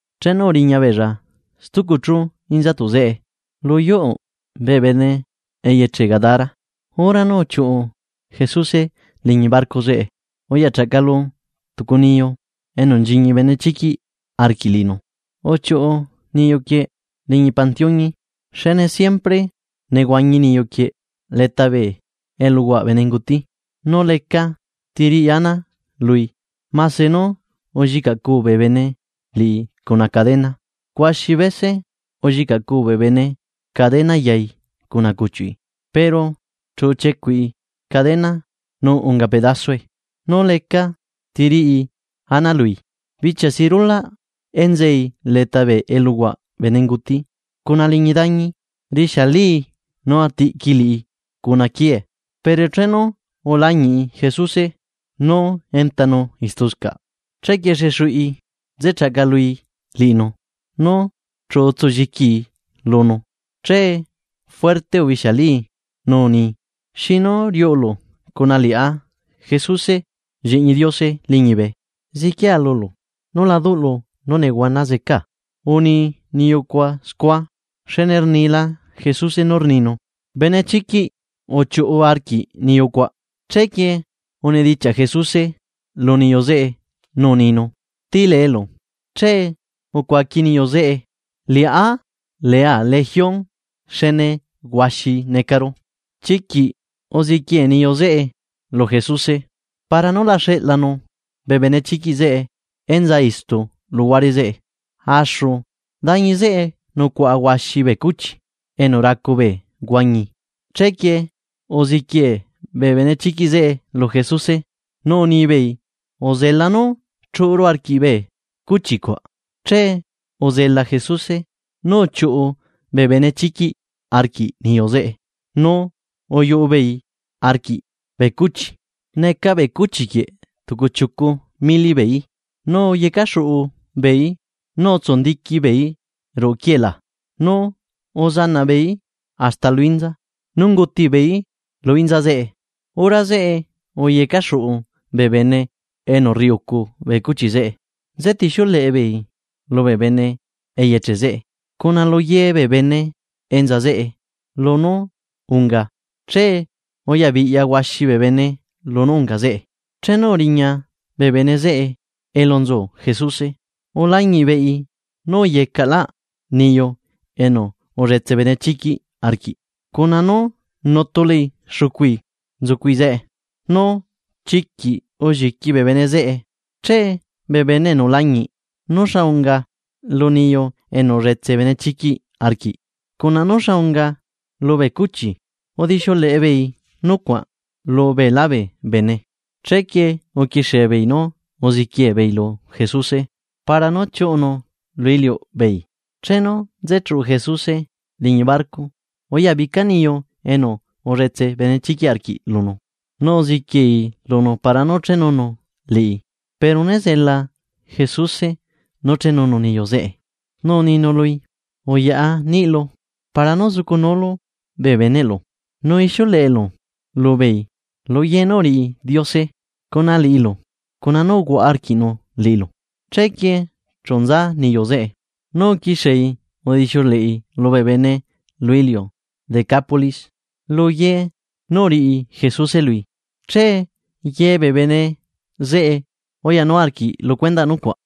Chenu uriña beella stucu chú inzatuꞌ zeꞌe, lu yuꞌu bee bene eyeche Gadara. Hora nú uchiuꞌu Jesuse liñi barco zeꞌe uyachaꞌcalu tucu niyu enu nchiñi benechiquiꞌ arquiꞌ liꞌinu, uchiuꞌu niyu quieꞌ liñi pantiuñi. Xne siempre nehuañi niyuquieꞌ leta bee eluhuaꞌ bee bene nguti. Nu lecati riꞌi ana lui, mase nú ullicaꞌcuu bee bene liꞌi cuna cadena. Huaxi bese ullicaꞌcuu bee bene cadena yai cuna cuchiuꞌi, pero chu uchiecuꞌi cadena nu unga pedasue, nu lecati riꞌi ana lui. Bichia si rulaꞌ enzei leta bee eluhuaꞌ bee bene nguti cuna liñi dañi, rixialii nu uchiecuꞌi liꞌi cuna quiee. Pero chenu ulañiꞌi Jesuse, nú entanu istuscaꞌ chequie xexuꞌi nze chaꞌcalui liꞌinu, nu chu utsulliquii lunu. Che juerte urixialii nu uni: ―¿Xinu riuꞌulu cuna liꞌá Jesuse lliñi Diose liñibe? Ziquia lulu nú la duꞌlu nú nehuana zecaa. Uni niyucuaꞌ scua, xne rnila Jesuse nú rninu: ―¡Benechiquiꞌ uchiuꞌu arquiꞌ niyu cuaꞌ! Chequie unidichiaꞌ Jesuse lu niyu zeꞌe nú uninu: ―¿Ti leelu? Che ucuaqui niyu zeꞌe: ―Liꞌá lea Legión xne huaxi necaru. Chiquiꞌ uziquiee niyu zeꞌe lu Jesuse, para nú la xeꞌlanu bee benechiquiꞌ zeꞌe enza istu luhuare zeꞌe. Axu dañi zeꞌe nucuaꞌa huaxi bee cuchi enu racu bee huañi. Chequie uziquiee bee benechiquiꞌ zeꞌe lu Jesuse nú unibeei, uzela nú chuꞌuru arquiꞌ bee cuchi cuaꞌ. Che uzela Jesuse nú uchiuꞌu bee benechiquiꞌ arquiꞌ niyu zeꞌe, nu uyuꞌu beei arquiꞌ bee cuchi. Neca bee cuchi quieꞌ tucu chiucu mili beeí. Nu uyecaxuꞌu beeí nu utsundiqui beeí ruꞌu qiuee laa nu uzanaꞌ beeí hasta lu inza nu chu unguti beeí lu inza zeꞌe. Hora zeꞌe uyecaxuꞌu bee bene enu rriucu bee cuchi zeꞌe nzetixiuleꞌe beei lubee bene eyeche zeꞌe cuna lu ye bee bene enza zeꞌe lunú unga. Che uyabiꞌya huaxi bee bene lunú unga zeꞌe. Chenu uriña bee bene zeꞌe elu nzu Jesuse, ulañiꞌ beei nú uyecaꞌlaꞌ niyu enu ulletse benechiquiꞌ arquiꞌ cuna nú nutulai xucui nzucui zeꞌe. Nu chiquiꞌ ulliqui bee bene zeꞌe. Che bee bene enu ulañiꞌ nú xa unga lu niyu enu ulletse benechiquiꞌ arquiꞌ cuna nú xa unga lubee cuchi, udixiuleꞌe beei nucuaꞌ lu beelá bee bene. Chequie uquixie beei nú uziquiee beei lu Jesuse para nú chiuꞌunu lu iliuꞌbeei. Chenu nze chuꞌu Jesuse liñi barco uyabica niyu enu ulletse benechiquiꞌ arquiꞌ lunu, nu uziquiei lunu para nú chenunu liꞌi. Pero né zela Jesuse nú chenunu niyu zeꞌe nu uninu lui: ―Uyaꞌa niꞌilu para nú zucunulu bee beneꞌlu, nu ixiuleꞌelu lubeei lu ye nú uriꞌi Diose cuna liꞌilu, nu cuna nú uhuaꞌa arquiꞌnu liꞌilu. Chequie chu nza niyu zeꞌe, nu uquixiei udixiuleꞌi lubee bene lu iliu Decápolis, lu ye nú uriꞌi Jesuse lui. Che ye bee bene zeꞌe uyanu arquiꞌ lu cuendaꞌ nucuaꞌ.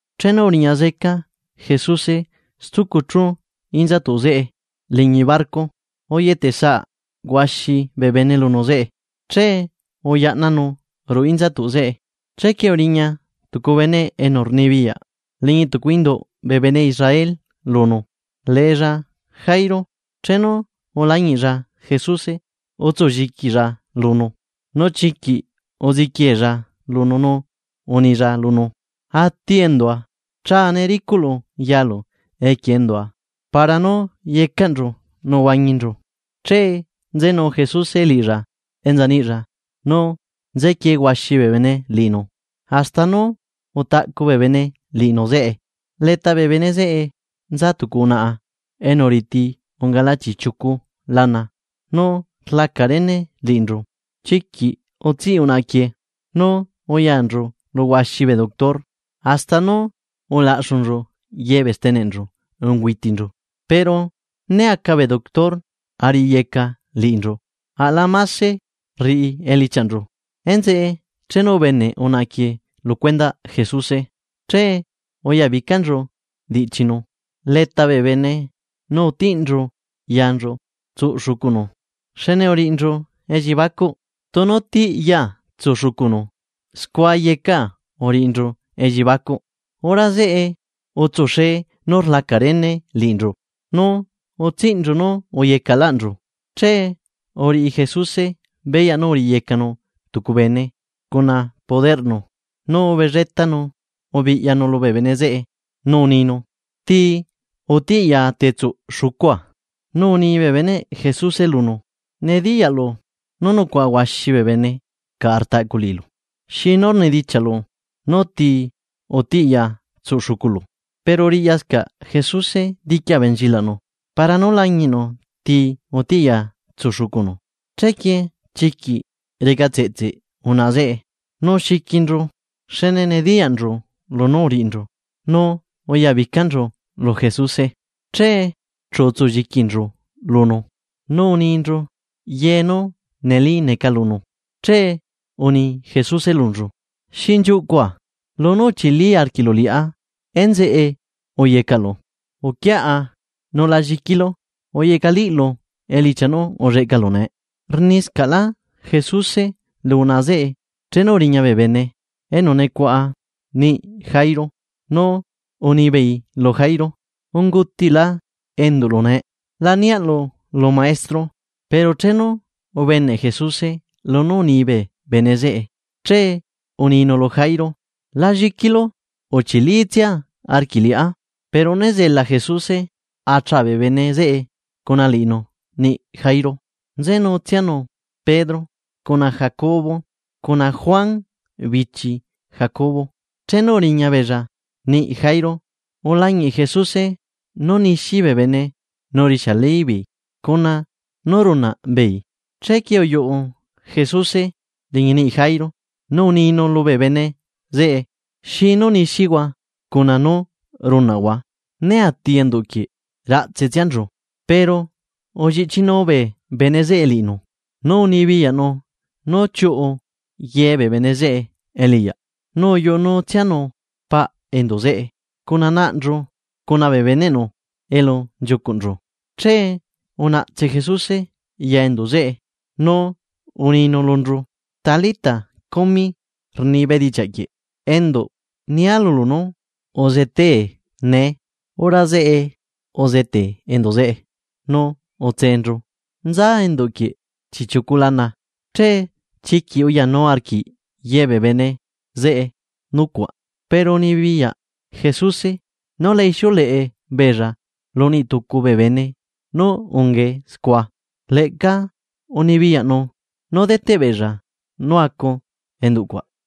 Chenu uriña zeca Jesuse stucu chu inzatuꞌ zeꞌe liñi barco, uyetesaꞌ huaxi bee bene lunu zeꞌe. Che uyaꞌnanu ruꞌu inzatuꞌ zeꞌe. Chequie uriña tucu bene enu rnibiyaꞌ liñi induꞌ bee bene Israel lunu, leella Jairo. Chenu ulañiꞌlla Jesuse utsu lliquilla lunu. Nu chiquiꞌ uziquieella lunu nú unilla lunu: ―Mero ati endua chaa nee ricuꞌlu yalu equie endua para nú yecaꞌnchu nu la atinchu. Che nzenu Jesuse liꞌilla enza niꞌlla nu nzequiee huaxi bee bene liꞌinu hasta nú utaꞌcu bee bene liꞌinu zeꞌe. Leta bee bene zeꞌe nza tucu unaꞌa enu riti, ungala chiꞌchiucu lana nú rlaca rene liꞌinchu. Chiquiꞌ nehuana ulleꞌca unaꞌa quieꞌ nu uyanchu lu huaxi bee doctor, hasta nú ulaꞌxunchu ye bee steneꞌnchu ungüitinchu. Pero né aca bee doctor a riꞌiyeca liꞌinchu, aꞌla mase rriꞌi elichiaꞌnchu. Enzeꞌe chenu ubeneꞌ unaꞌa quieꞌ lu cuendaꞌ Jesuse, che uyabicanchu diꞌchinu leta bee bene nu utiꞌnchu yanchu tsuꞌ xucunu. Xne uriꞌinchu elliebacuꞌ: “Tunu tiꞌyaa tsuꞌ xucunu, scua yecaa uriꞌinchu elliebacuꞌ.” Hora zeꞌe utsuxee nú rlaca rene liꞌinchu nu utsiꞌnchu nú uyecaꞌlaꞌnchu. Che uriꞌi Jesuse beyaꞌ nú uriyecanu tucu bene cuna poderꞌnu, nu ubelletanu ubiꞌyanu lubee bene zeꞌe nu uninu: ―¿Ti utiꞌ yaa tetsuꞌ xucua? Nu uni bee beneꞌ Jesuse lunu: ―Nediyaꞌlu nú nucuaꞌa huaxi bee bene caꞌa rtaꞌcu liꞌilu: ¿Xinu rnidichiaꞌlu nú tii utiꞌ yaa tsuꞌ xuculu? Pero riꞌyascaꞌ Jesuse diqui abenchilaꞌnu para nú lañiꞌnu tii utiꞌyaa tsuꞌ xucunu. Chequie chiquiꞌ reca tseꞌtse unaꞌa zeꞌe nú xiquinchu xne nediyaꞌnchu lunú uriꞌinchu, nu uyabicanchu lu Jesuse, che chu utsu lliquinchu lunu, nu uninchu ye nú ulleꞌcanchu lunu. Che uni Jesuse lunchu: ―Endua lunú uchili arquiꞌlu liꞌá enzeꞌe uyecaꞌlu, uquiaꞌa nu la lliquilu uyecaꞌliꞌlu elichia nú ulleꞌcalu nee. Rniscaꞌla Jesuse lu unaꞌa zeꞌe chenu uriña bee bene enu nucuaꞌa niꞌi Jairo nu unibeei lu Jairo: ―Unguutila enduꞌlu nee. La niaꞌlu lu maestro. Pero chenu ubeneꞌ Jesuse lunú uni bee bene zeꞌe. Che uninu lu Jairo: ―La lliquilu uchilitsia arquiꞌ liꞌá. Pero né zela Jesuse a chaa bee bene zeꞌe cuna liꞌinu niꞌ Jairo. Nzenutsianu Pedro, cuna Jacobo cuna Juan bichi Jacobo. Chenu uriña beella niꞌi Jairo, ulañiꞌ Jesuse nú nixi bee bene nu rixiali beei cuna nú runaꞌ beei. Chequie uyuꞌu Jesuse liñi niꞌi Jairo nu uninu lubee bene zeꞌe: ―¿Xinu nixihua cuna nú runaꞌhua? Né ati enduꞌ quieꞌ ratse tsianchu. Pero ulliꞌchinuu bee bene zeꞌe liꞌinu, nu unibiyaꞌnu nú chiuꞌu ye bee bene zeꞌe eliꞌyaꞌ, nu uyuꞌu nutsianu paꞌ enduꞌ zeꞌe cuna naꞌnchu cuna bee beneꞌnu elu nchiucuꞌnchu. Che unaꞌtse Jesuse ya enduꞌ zeꞌe, nu uninu lunchu: ―Talita, cumi ―rni bedichiaꞌ quieꞌ: Enduꞌ, nia lulu nú, uzetee nee. Hora zeꞌe uzetee enduꞌ zeꞌe nu utseenchu, nza enduꞌ quieꞌ chiꞌchiucu lana, che chiquiꞌ uyanu arquiꞌ yebee bene zeꞌe nucuaꞌ. Pero unibiyaꞌ Jesuse nú la ixiuleꞌe beella lu niꞌ tucu bee bene nú ungae scua. Leꞌca unibiyaꞌnu nú deteꞌ beella nú acu enduꞌ cuaꞌ.